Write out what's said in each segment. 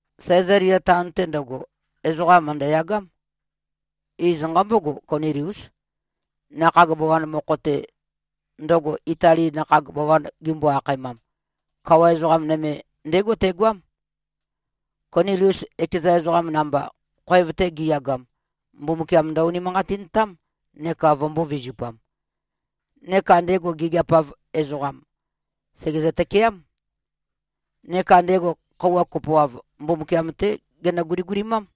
Sæzalia taon-te ndøgo, ezoqa mø̀ndøyagám. Iz nqambógo, Koniliús. Nakhag bawan mokho-te, ndøgo Itali nakhag bawan gimbo-akhaemam, kawa ezoqam nøme ndégo tegoám. Konilius ekeza ezoqa namba, khoev-te gi꞉yagam, Mbumbukiam ndø-unimanqatintám neka vømbō-vizupam. Neka ndego gigiap-av ezoqam, sègezø-tøkeám. Neka ndego khøuwa kopoav, Mbumbukiam-té genø-guligulimám.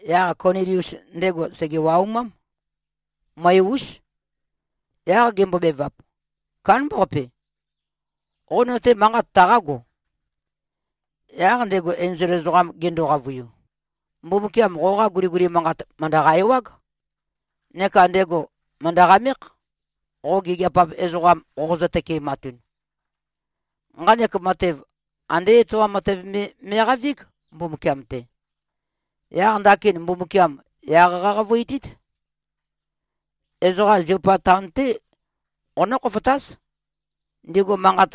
Yaq Konilius, ndego sège-waumám. Møe-ús. Yaq gembobevap, “Kándambaqape. Qo no-te manqat taqágo?” Yaq ndego enzol ezoqam gendo-qavøiu, “Mbumbukiam qoqa guliguli manqat, mø̀ndøqa-ewág. Neka ndego mø̀ndø-qamékh, qo gigiap-av ezoqam qoqozø-tøkematun. Nqanek matev, andé etoam matev me me꞉qavíg, Mbumbukiam-te. Yaq ndakin Mbumbukiam yaq qaqavøitít. Ezoqa Ziopa taon-té qonǿ-khofotáz. Ndigu manqat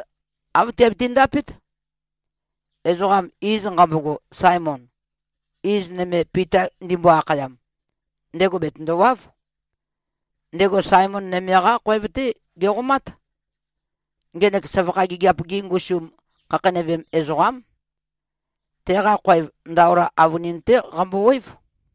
āv tiabiti-ndapét. Ezoqam, iz nqambogo Saemon, iz nøme Pita ndimbo-akhayam, ndego bètøndowáv. Ndego Saemon nøme-qá khoev-té geqomát. Ngenek søvakha gigiap-gi ngusum khakheinøvem ezoqám. Teqa khoev ndaola avønin-té qambowév.”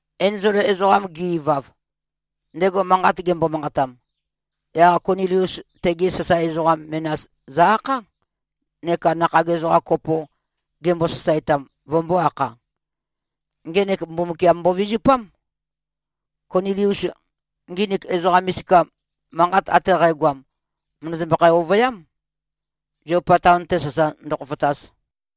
Enzol ezoqam ge-ivav, ndego manqat gembo-manqatam, yaq Konilius tegi sasae ezoqa menas zø-akhá, neka nakhag ezoqam kopo, gembo-sasaetam, vømbō-akha. Ngenek Mbumbukiam mbovizupám. Konilius nginik ezoqa misika, manqat ate qægoam, mø̀ndøzømbøkhæ-ovøyám, Ziopa taon-te sasa ndøkhofotaz.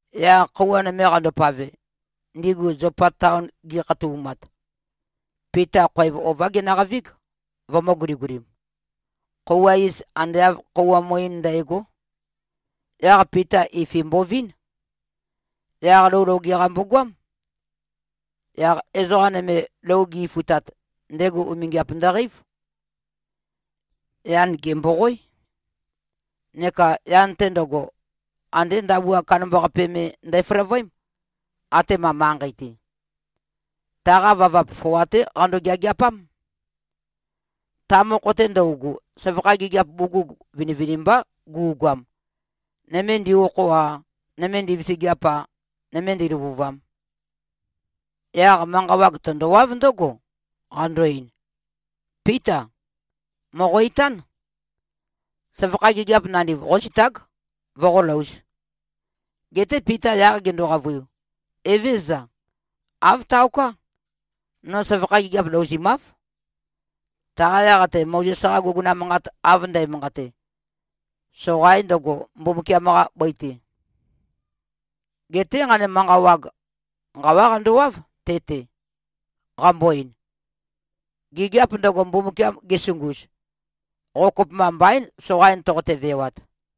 Yaq khøuwa nøme qandopave, ndigu Ziopa taon gikhatoumat, Pita khoev ová genøqavíg, vømø̄-guligulim. Khøuwa iz, ande āv khøuwa muín ndægó. Yaq Pita ifin mbovín. Yaq lou loge-qa mbogoám. Yaq ezoqa nøme lou gi-ifutat, ndego umingiap ndøqeív. Yan gèmboqoé. Neka yan-te ndøgo, andé ndabua kandambaqape me ndæføløvøém, atema manqei-te. Taqa vavap foa-té qando-geageapám. Ta mokho-te ndøugu, søvakha gigiap bugug vinivinimbá gu꞉goam, nøme ndi-okho-a, nøme ndivisigiap-a, nøme ndīlø̄vūvām. Yaq manqa wag tøndowáv ndǿgo, qando-ein, “Píta! Mòqo-itán. Søvakha gigiap nandiv qózitág, voqólōuz.” Geté Pita yaq gendo-qavøiu, “Evézøza. Āv taoká. No søvakha gigiap louzimáv, taqa yaq-te Mozes-qa guguna manqat av ndæmanqate, soqain ndøgo, Mbumbukiam-qa bøi-te.” Geté nqanek manqa wag, nqawá qandowáv, te-te, qambo-ein, “Gigiap ndøgo, Mbumbukiam gesunguz, qo kopømba mbaín, soqain toqote-vewat.”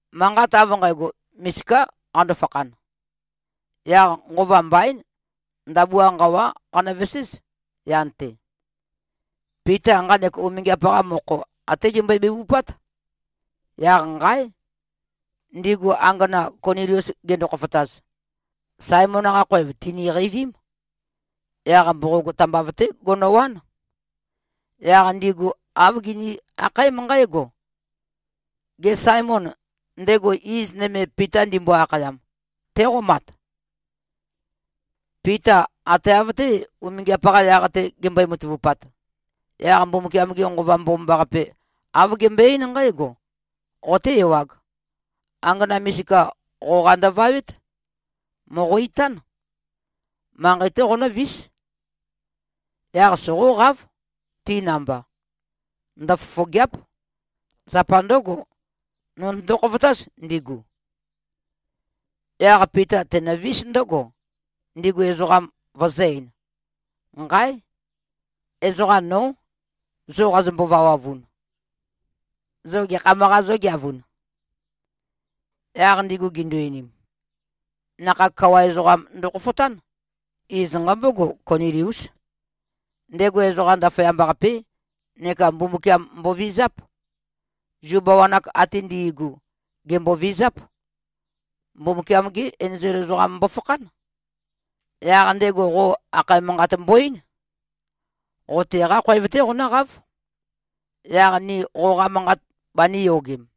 Manqat av nqægo, misiká qando-fakhan. Yaq nqova mbaín, ndabua nqawá qanøveséz, yan-te. Pita nqanek umingiap-qa mokho até gembøe-bevupát, yaq nqáe! Ndigu angana, Konilius gendo-khofotaz, Saemon-qa khoev tìniqeivím. Yaq mboqog tambav-té gonowán. Yaq ndigu āv gini-akhaém nqǽgo, “Gê, Saemon, ndego iz nøme Pita ndimbo-akhayam, téqomat?” Pita ate av-té, umingiap-qa yaq-te gembøe-matavupat, yaq Mbumbukiam-ge Nqova Mbomambaqape, āv gembøe-eín nqǽgo, “Qoté-ewāg. Angana misika qoqa ndøvawét. Mòqo-itán. Manqei-té qonǿvís. Yaq soqóqáv, ti namba. Ndøfofògea᷄p. Zapa ndǿgo, nō notøndo-khofotáz, ndigu.” Yaq Pita tenøvís ndǿgo, ndigu ezoqam vøzø̄-ein, “Nqáe! Ezoqam nó, zo qazombo-vawavun. Zo gekham-qā zógeavun?” Yaq ndigu gindu-einim, “Nakhag kawa ezoqam ndokhofotán. Iz nqambógo, Koniliús. Ndego ezoqam ndaføyamba-qapé neka Mbumbukiam mbovizáp. Zu bawan-ak ate ndi꞉gu, gèmbovizáp. Mbumbukiam-gé enzol ezoqam mbofakhán. Yaq ndego qo akhae manqat mbo-eín. Qo teqá khoev-té qonǿqáv, yaq ni qoqa manqat banīyogem.”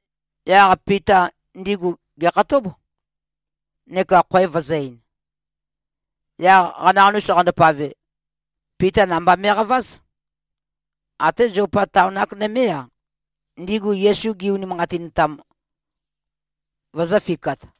Yaq Pita ndigu gèkhatób, neka khoev vøzø̄-ein. Yaq qanaqanus qandopave, Pita namba me꞉qaváz. Até Ziopa taon-ak nømé-a, ndigu Yesu gi-unimanqatintam, vøzø̄fikat.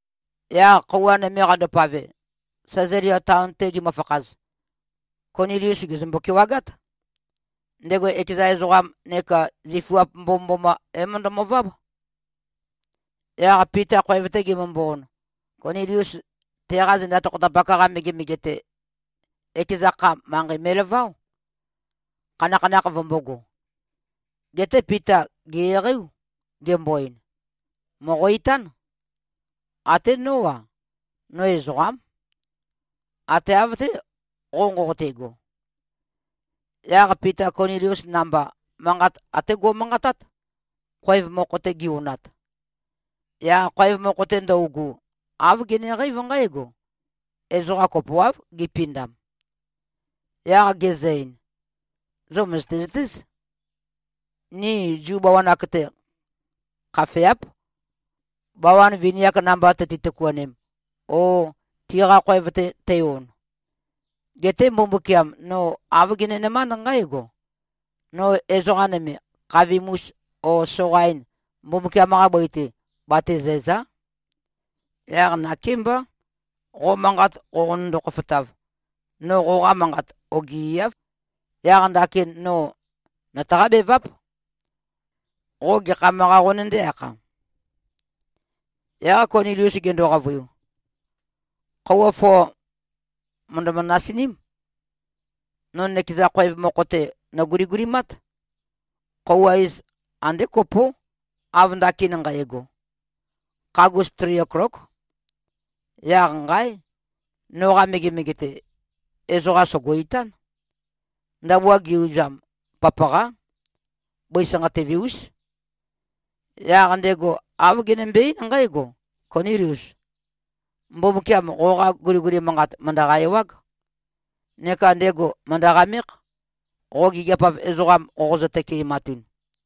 Yaq khøuwa nøme qandopave, Sæzalia taon-te gimøfakhaz, Konilius gèzømbo-kewagát. Ndego ekeza ezoqam neka zifuap mbomømboma, é-møndømøváb. Yaq Pita khoev-te gemømbo-on, Konilius teqa zenda tokhopatak-qa megemege-te, ekeza kha, manqei me꞉laváo, khanakhanakh vømbōgo. Geté Pita gè-eqeiú, gembo-ein, “Mòqo-itán. Até nó-a, no ezoqám. Ate av-té, qo nqoqote꞉go.” Yaq Pita Konilius namba, manqat até go꞉manqatát, khoev mokho-te gi-onat. Yaq khoev mokho-te ndøugu, āv geneqeív nqǽgo: Ezoqa kopoáv, gipindam. Yaq gezø-ein, “Zo mø̀zøte-zøtéz. Ni Zu bawan-ak-te, khafeáp, bawan vini-ak namba tøti-tøkuanem o tiqa khoev-te tei-on. Geté Mbumbukiam, no āv genenømánd nqǽgo: No ezoqa nøme, khavim-us o soqain, Mbumbukiam-qa bøi-te, batezæ̀za᷄. Yaq nakémbá, qo manqat qoqonøndo-khofotav, no qoqa manqat ogieáv. Yaq ndakin no nøtaqá-beváp. Qo gekham-qā, qonøndé-akha?” Yaq Konilius gendo-qavøiu, “Khøuwa foa mø̀ndømø-nasiním. No nøkeza khoev mokho-te, nòguligulimát. Khøuwa iz ande kopó, av ndakin nqægo. Khagus tri oklók. Yaq nqáe! Noqa megemege-te, ezoqam sògo-itán. Ndabua ge-uzam, papaqá. Bøi sanqatøve-ús. Yaq ndego āv genømbe-eín nqǽgo, ‘Konílius! Mbumbukiam qoqa guliguli manqat mø̀ndøqa-ewág. Neka ndego mø̀ndø-qamékh, qo gigiap-av ezoqam qoqozø-tøkematun.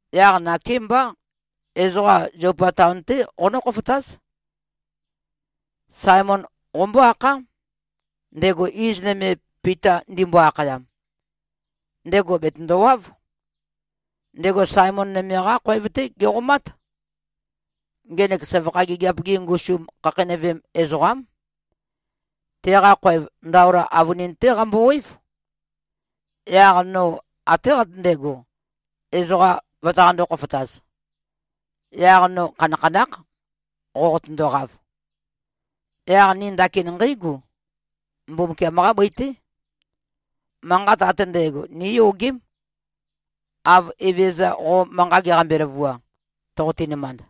Yaq nakémbá. Ezoqa Ziopa taon-té qonǿ-khofotáz. Saemon qombó-akhá, ndego iz nøme Pita ndimbo-akhayam. Ndego bètøndowáv. Ndego Saemon nøme-qá khoev-té geqomát. Ngenek søvakha gigiap-gi ngusum khakheinøvem ezoqám. Teqa khoev ndaola avønin-té qambowév.’ Yaq no até qatøndego, ezoqam vøtaqandō-khofotaz. Yaq no khanakhanákh, qoqotøndoqav. Yaq ni ndakin nqéigu. Mbumbukiam-qá bøi-té. Manqat ate ndægo níyogém, av Evezøza qo manqa geqambe-løvua, toqoti-nømand.”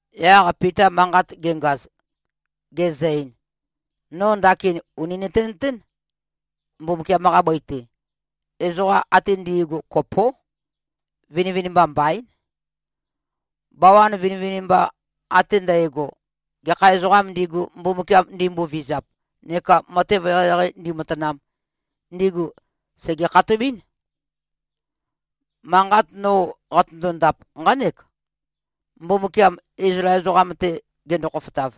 Yaq Pita manqat gengaz, gezø-ein, “No ndakin ùni nøtenøtén. Mbumbukiam-qa bøi-te, ezoqam ate ndi꞉gu kopó. Vinivinimba mbaín. Bawabawan vinivinimba ate ndægo, gekha ezoqām ndigu, Mbumbukiam ndimbovizap neka matev eqeieqei ndīmātānām, ndigu sège-khatobɨ́n. Manqat no qatøndo-ndap, nqánek, Mbumbukiam Izlael ezoqam-te gendo-khofotav,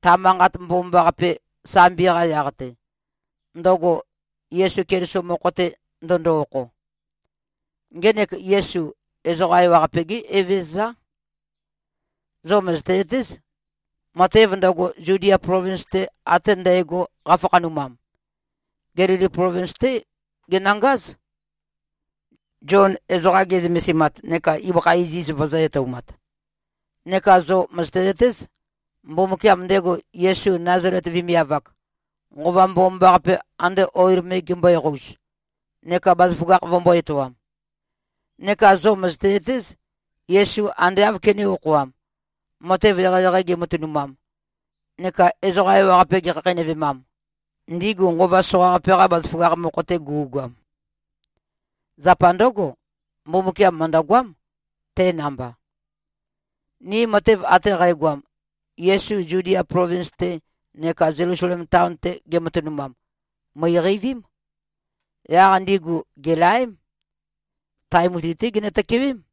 ta Manqat Mbomambaqape, sambi-qa yaq-te, ndøgo Yesu Keliso mokho-te ndøndo-okho. Ngenek Yesu, ezoqa ewaqape-gé Evezøzá. Zo mø̀zøte-zøtéz, matev ndøgo, Zudia plovins-te ate ndægo qafakhanumam. Gelili plovins-té genøngáz, Zion ezoqa ge꞉zømesimat neka ibøkha iziz vøzø̄-etoumat. Neka zo mø̀zøte-zøtéz, Mbumbukiam ndego Yesu Nazalet vemiav-ak, Nqova Mbomambaqape ande oil me gembøe-qouz neka bazaføgakh vømbō-etoam. Neka zo mø̀zøte-zøtéz, Yesu ande āv kenē-okhoam, matev eqeieqei gematønumam neka ezoqa ewaqape gekhakheinøvemam, ndigu nqova soqaqape-qa bazaføgakh mokho-te gu꞉goam. Zapa ndǿgo, Mbumbukiam mø̀ndøgoám, te namba. Ni matev ate qægoam, Yesu Zudia plovins-te neka Zelusalem taon-te gematønumam, mø̀iqeivím. Yaq ndigu gèlaém. Tae mutui-té ginø-tøkewém.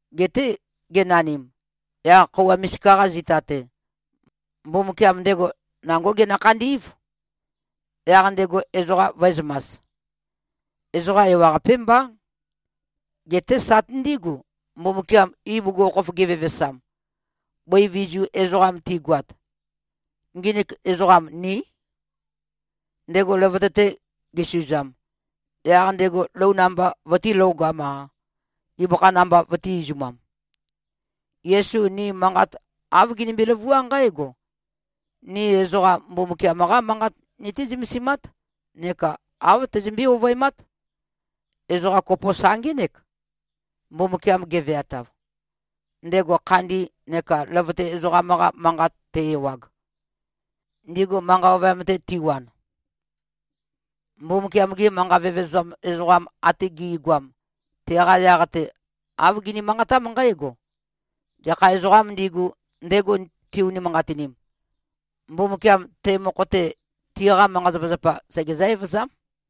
Geté genanim, yaq khøuwa misika-qa zita-te, Mbumbukiam ndego nangó genø-khandí꞉v, yaq ndego ezoqa vø̄ezømas. Ezoqa ewaqapé mbá. Geté sati ndígu, Mbumbukiam ibugukhokhof gevevesam, bøi vizu ezoqam tigoat. Nginik ezoqam ní. Ndego løvøte-te gesuzam, yaq ndego lou namba vøtīlogam-a, ibøkha namba vøtī-izumam. Yesu ni manqat āv ginimbi-løvuá nqǽgo: Ni ezoqa Mbumbukiam-qá Manqat nití-zømesimát neka āv teizømbé-ovøemát, ezoqa kopo sa ngének, Mbumbukiam geveatav, ndego khandi neka løvøte ezoqam-qa manqat te-ewag, ndigu manqa ovøyam-te tiwan. Mbumbukiam-gi manqa vevezam ezoqam ate gi꞉goam, teqa yaq-te āv gini-manqatám nqǽgo, ‘Gekha ezoqām ndigu, ndego ti-unimanqatinim, Mbumbukiam te mokho-te, tiqa manqa-zapazapa segezǿ-evøzám.’”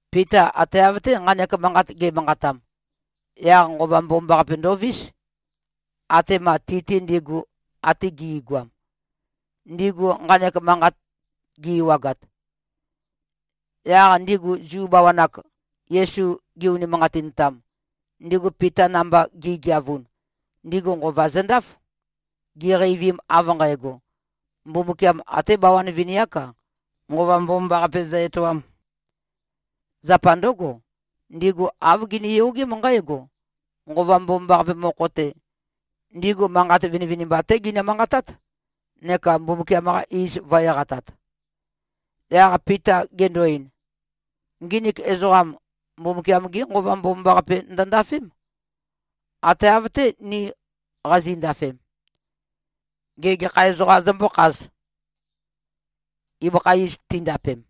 Pita ate av-té nqanek manqat ge꞉manqatam, yaq Nqova Mbomambaqape ndovís, atema ti-te ndigu ate gi꞉goam, ndigu nqanek manqat gi-ewagat. Yaq ndigu Zu bawan-ak, Yesu gi-unimanqatintam, ndigu Pita namba gi꞉geavun, ndigu nqova zøndáf, giqeivim av nqægo, Mbumbukiam até bawan vini-ák-a, Nqova Mbomambaqape zø-etoām. Zapa ndǿgo, ndigu āv giniyogém nqǽgo: Nqova Mbomambaqape mokho-te, ndigu manqat vinivinimba-té ginø-manqatát neka Mbumbukiam-qa iz vø̄-eqatat. Yaq Pita gendo-ein, “Nginik ezoqam, Mbumbukiam-gé Nqova Mbomambaqape ndøndafém, ate av-té, ni qazi꞉ndafem. Gê, gekha ezoqā zømbǿkhāz, ibøkha iz tindapem?”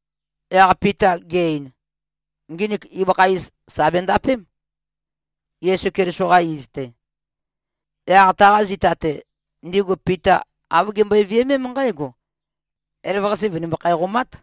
Yaq Pita ge-ein, “Nginik ibøkha iz, sà bendapém, Yesu Keliso-qa iz-te.” Yaq taqa zita-te, ndigu Pita āv gimbøe-viømém nqǽgo, “Elavøqase vø̀nimbøkhæ-qomát.”